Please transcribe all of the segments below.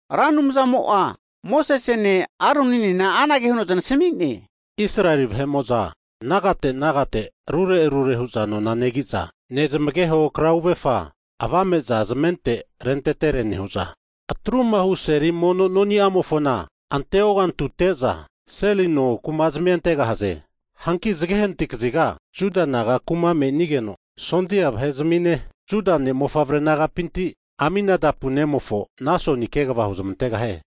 Ra Anumzamo'a Mosesene Aroninena anage huno zanasami'ne, Israeli vahe'mo'za nagate nagate rure rure hu'za nona negi'za, nezmageho krauefa (flag) avame'za zamente rentetere nehu'za, atrumahu Seli mono noni'amofona ante ogantute'za seli no kumazmia antegahaze. Hanki zage hanati kaziga Juda naga kuma menigeno, sondia vahe'zmine Juda ne'mofavre nagapinti Aminadab nemofo Nasoni kegava huzamantegahie.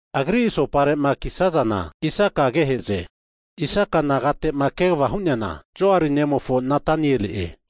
Agri asoparema kisazana Isaka agehe'ze, Isaka nagate'ma kegava hu'neana, Zuar nemofo Netanieli'e.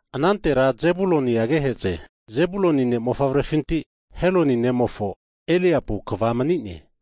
Anantera Zebuluni agehe'ze, Zebuluni ne'mofavrefinti Heloni nemofo Eliabu kva mani'ne.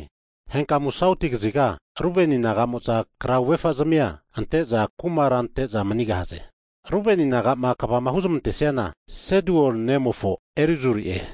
Henkamu sauti kaziga Ruben naga'mo'za krauefazamia ante'za kumara ante'za manigahaze. Rubeni nagama kvama huzmantesiana Sedeur nemofo Elizuri'e.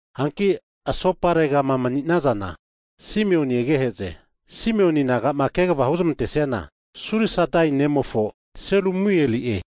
Hanki asoparegama mani'nazana Simeon agehe'ze, Simeon naga'ma kegava huzmantesiana, Surisadai nemofo Selumieli'e.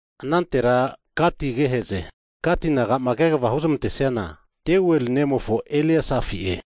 Anantera Gati agehe'ze, Gati nagama kegava huzmantesiana, Deuel nemofo Eleasafi'e.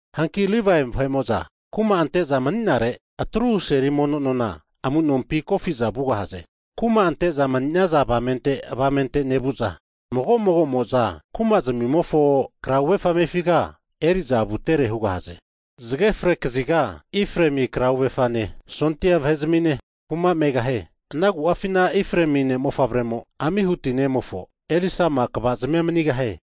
Hanki Livae vahe'mo'za kuma ante'za mani'nare atruhu seli mono nona amu'nompi kofi'za vugahaze, kuma ante'za mani'naza avamente avamente nevu'za mago mago'mo'za kumazmimofo krauefa amefiga eri'za vutere hugahaze. Zage fre kaziga Efraemi krauefane, sondia vahe'zmine, kuma megahie. Ana agu'afi Efraemi ne'mofavremo Amihuti nemofo Elisama kvazmia manigahie.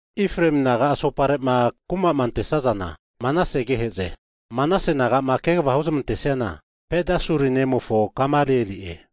Efraemi naga asoparema kuma ante'sazana, Manase agehe'ze. Manase nagama kegava huzmantesiana, Pedasuri nemofo Gamalieli'e.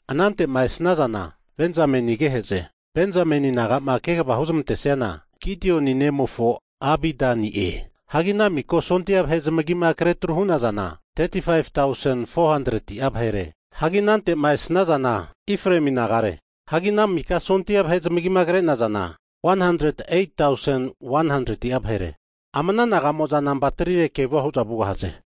Anante'ma esnazana Benjamen agehe'ze, Benjamen nagama kegavama huzmantesiana, Gideoni nemofo Abidani'e. Hagi ana miko sondia vahe zamagima kre tru hu'nazana 35tausen, 400'a vahere. Hagi anante'ma esnazana Efraemi nagare. Hagi ana miko sondia vahe zamagima kre'nazana 108tausen, 100'a vahere. Ama ana naga'mo'za nampa trire kevu hu'za vugahaze.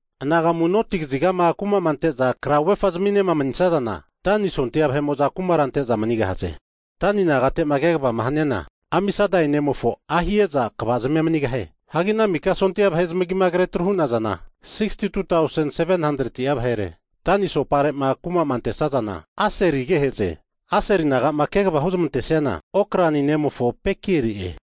Anagamu noti kazigama kumama ante'za krauefa zaminema manisazana, Dani naga sondia vahe'mo'za kumara ante'za manigahaze. Dani nagatema kegava haniana, Amisadai nemofo Ahieza kvazmia manigahie. Hagi ana mika sondia vahe zamagima kre tru hu'nazana 62tausen, 700'a vahere. Dani asopare kumama antesazana Aseli agehe'ze, Aseli nagama kegava huzmantesiana, Okran nemofo Pagieli'e.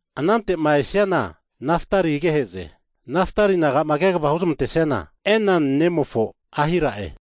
Anante'ma esazana Naftali agehe'ze. Naftali nagama kegava huzmantesiana, Enan nemofo Ahira'e.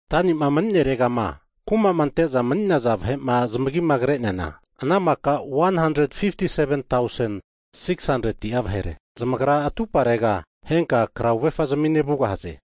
Dani naga'ma mani'neregama kumama ante'za mani'naza vahe'ma zamagima kre'neana, ana maka 157tausen, 600'a vahere. Zamagra atuparega henka krauefa zamine vugahaze.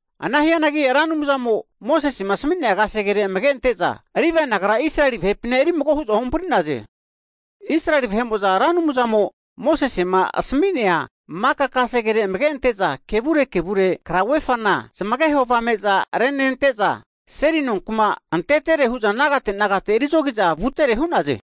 Ana hianagi, Ra Anumzamo Mosesema asmi'nea kasegere amage ante'za, Livae nagara Israeli vahepina eri mago hu'za ohampri'naze. Israeli vahe'mo'za Ra Anumzamo Mosesema asmi'nea maka kasegere amage ante'za, kevure kevure krauefana (flag) nezamageho avame'za renente'za, seli nonkuma antetere hu'za nagate nagate eri zogiza vutere hu'naze.